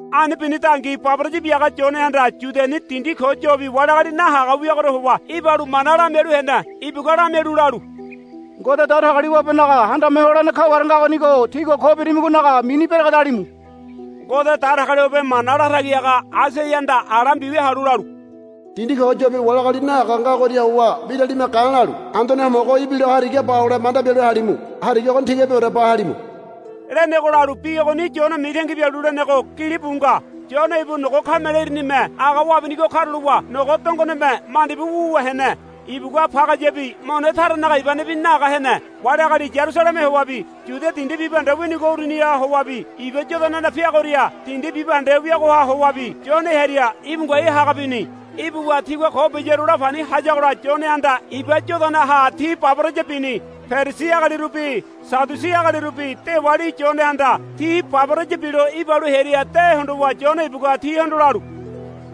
Ani binidangi baboraya biaga Yonehanda Yudiani dindi ko yobi wali agali nahaga wiagoria howa ibalu mana lamialu hene. Ibugua lamialu lalu, Ngode Datagaliwabenaga Handame Holene kaware ngagonigo tígua ko birimigonaga mini beregedalimu. Ngode Datagaliwabe mana latagi haga Aisaiahanda ala mbiwia halu lalu, Dindi ko yobi wali agali nahaga ngagoria howa mbiralime ga̱lalu, Anduane Homogo ibilo hariga ba hole manda bialu halimu. Hariga ogoni tigabiore ba halimu, lenego lalu bi ogoni Yone mitangi bialu lenego gilibu nga. Yone ibu nogo kamele irinime aga wabinigo karulowa nogo dongoneme mandibu wuwa hene. Ibugua pagayabi mone taranaga ibanebi naga hene. Wali agali Yarusaleme howabi Yudia dindi bibahende winigo uruniha howabi Iba Yodana peagoria dindi bibahende wiagoha howabi Yone hearia íbu ngoai haga bini. Ibuwa tigua ko biyaru la pani hayagola Yonehanda Iba Yodanaha ti baboraya bini. Perisi agalirubi Sadiusi agalirubi dewali Yonehanda ti baboraya bilo ibalu hearia de hondowa Yone ibugua tihondo lalu,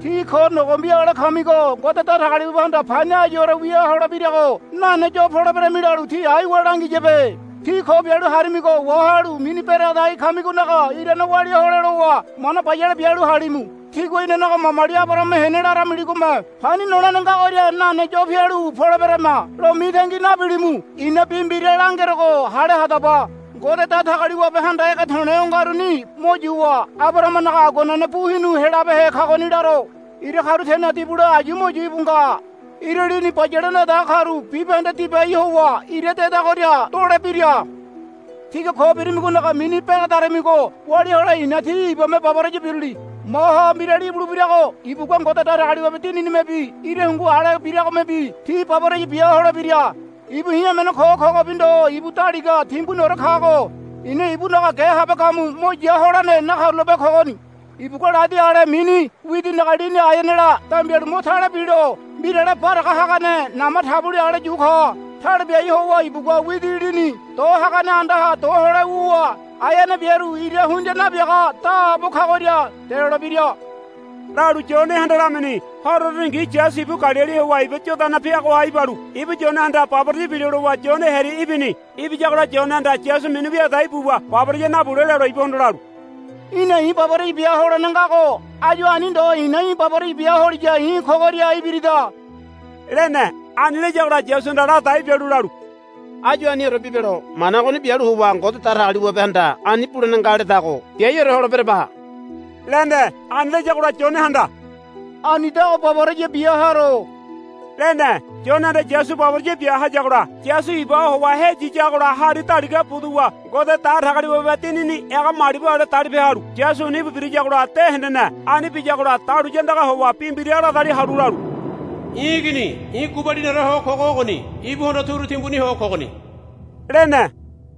Tí ko nogombi ale kamigo Ngode Datagaliwabehanda pani áyuore wia holebirago nane yo poleberami lalu tí aiwa langiyabe. Tígua ko bialu harimigo wahalu mini beregedai kamigonaga irane walia hole lowa mana bayale bialu halimu. Tígua, Inanaga mamali Abarahama hene, laramiligome pani nolene ngagoria nane yo pialu poleberama, lo mitangi nabilimu. I̱na bi mbira langerogo hale hadaba. Ngode Datagaliwabehanda ege to̱le̱ o ngaruni mo yuwa Abarahamanaga aguanene bu hinu helabehe kagoni laro. Ira karu teneha dibule ayu mo yu íbu nga. Ira lini bayale nadaga karu bibahende dibai howa ira dedagoria dolebira. Tígua ko birimigonaga mini beregedarimigo walia hole i̱na tí ibame baboraya biruli. Maha mbirali ibulebirago ibugua Ngode Datagaliwabe Dininimebi ira hungu ale biragomebi tí baboraya bia holebira. Ibu i̱ emene ko̱ kogobi ndo ibu daliga timbuniore kago i̱na ibunaga ge habe gamu mo ya holene nakarulape kogoni. Ibugua ladi ale mini widinaga lini aeanela dambialu mo tale bilo mbirale baraga hagane nama taboli ale yu ka. Tale biai howa ibugua widi lini do hagane andaha do hole wuwa aeane biaru ira hundia nabiaga daabo kagoria delolebira, lalu Yonehanda lamini. Horo uruningi Yasu ibu Galili howa Iba Yodana peagoha ibalu ibu Yonehanda baboraya bilo lowa Yone hearia ibini. Ibiyagola Yonehanda Yasu mini wia dai buwa baboraya nabule lelo ibuhondo lalu, Í̠na i̱ baboraya bia holene ngago áyu ani ndo i̱na í̠ baboraya bia holiya i̱ kogoria ibirida, lene. Ani layagola Yasuhanda ladai bialu lalu, Áyu aniore bibelo. Mana ogoni bialu howa Ngode Datagaliwabehanda ani bulene nga ledago biaiore holeberaba, lene. Ani layagola Yonehanda, Anidago baboraya bia haro, lene. Yonehanda Yasu baboraya bia hayagola Yasu ibaha howa heyiyagola hari daliga buduwa Ngode Datagaliwabe Dinini ega malibu ale dalipe halu Yasuni íbu birayagola de hendene. Ani biyagola dahuliya andagaha howa bi mbira ladali halu lalu, I̱ Igini i̱ gubaliniore ho kogo ogoni. Ibuhondo turu timbuni ho kogoni, lene.